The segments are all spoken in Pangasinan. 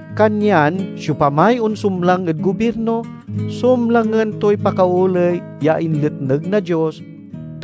Kanyan siopamay onsumlang ed gobirno, sumlangen toy pakaoley ya inletneg na Dios,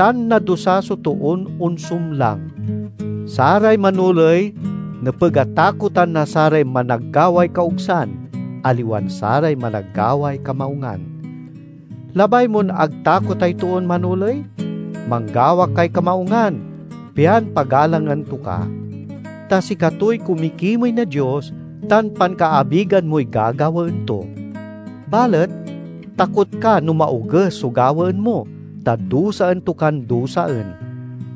tan nadusa so toon onsumlang. Saray manoley nepeg a takotan na saray managgaway kaogsan, aliwan saray managgaway kamaungan. Labay mon ag takotay toon manoley? Manggawa kay kamaungan, pian pagalangan to ka. Ta sikatoy kumikimey na Dios tan pankaabigan moy gagawaen to. Balet takot ka no maoges so gawaen mo, ta dusaen to kan dusaen.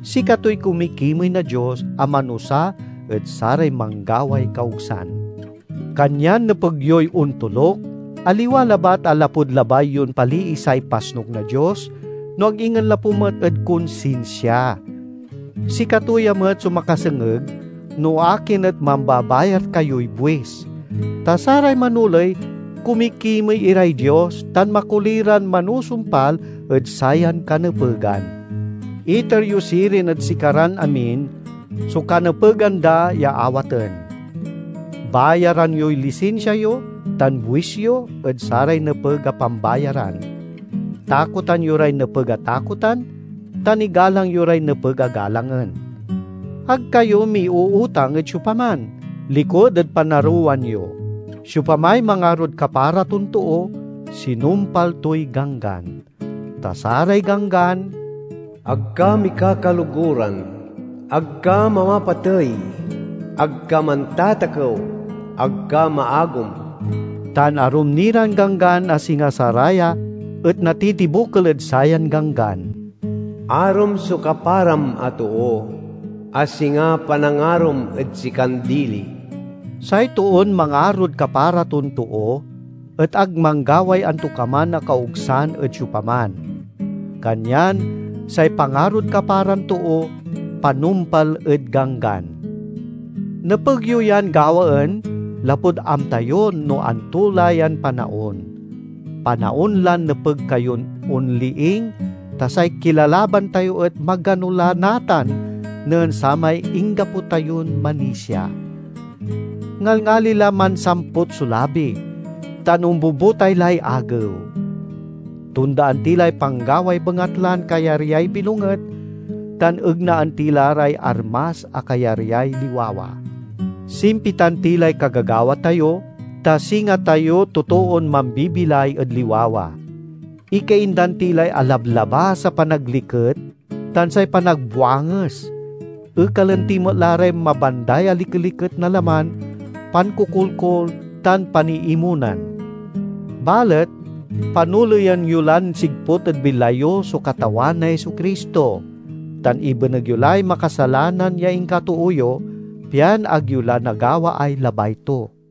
Sikatoy kumikimey na Dios a manusa ed saray manggaway kaogsan. Kanyan nepeg yoy ontoluk, aliwa labat a lapud labay yon paliisay pasnuk na Dios, no ag ingen lapu met ed konsinsia. Sikato ya met so makasengeg no akin et mambabayar kayoy buis. Ta saray manoley kumikimey iray Dios tan makoli ran manusumpal ed sayan kanepegan. Iter yo sirin ed sikaran amin so kanepegan da ya awaten; bayaran yoy lisinsia yo tan buis yo ed saray nepeg a pambayaran; takotan yo ray nepeg a takotan, tan igalang yo ray nepeg a galangen. Ag kayo miuutang ed siopaman, likud ed panarowan yo. Siopamay mangarod kapara ton too sinumpal toy Ganggan. Ta saray ganggan, "Ag ka mikakaloguran; ag ka mamapatey; ag ka mantatakew; ag ka maagom" tan arum ni ran ganggan a singa saraya et natitibokel ed sayan ganggan, "Arom so kaparam a too, a singa panangarom ed sikan dili." Say toon mangarod kapara ton too et ag manggaway antokaman a kaogsan ed siopaman. Kanyan say pangarod kaparan too panumpal ed Ganggan. Nepeg yo yan gawaen lapud amta yo no anto la yan panaon. Panaon lan nepeg kayon onliing, ta say kilalaban tayo et magano la natan nen samay inggapo tayon manisia. Ngalngali la mansamput so labi, tan ombubutay lay agew. Tondaan ti lay panggaway bengatlan kayaryay bilonget, tan egnaan ti la ray armas a kayaryay liwawa. Simpitan ti lay kagagawa tayo, ta singa tayo totoon mambibilay ed liwawa; ikaindan ti lay alablabas a panagliket tan say panagbuanges, ekalen ti met la ray mabanday a likeliket na laman, pankokolkol, tan paniimonan. Balet panoleyen yo lan sigput ed bilay yo so Katawan a Jesu-Cristo, tan ibeneg yo lay makasalanan ya inkatoo yo, pian ag yo la nagawaay labay to.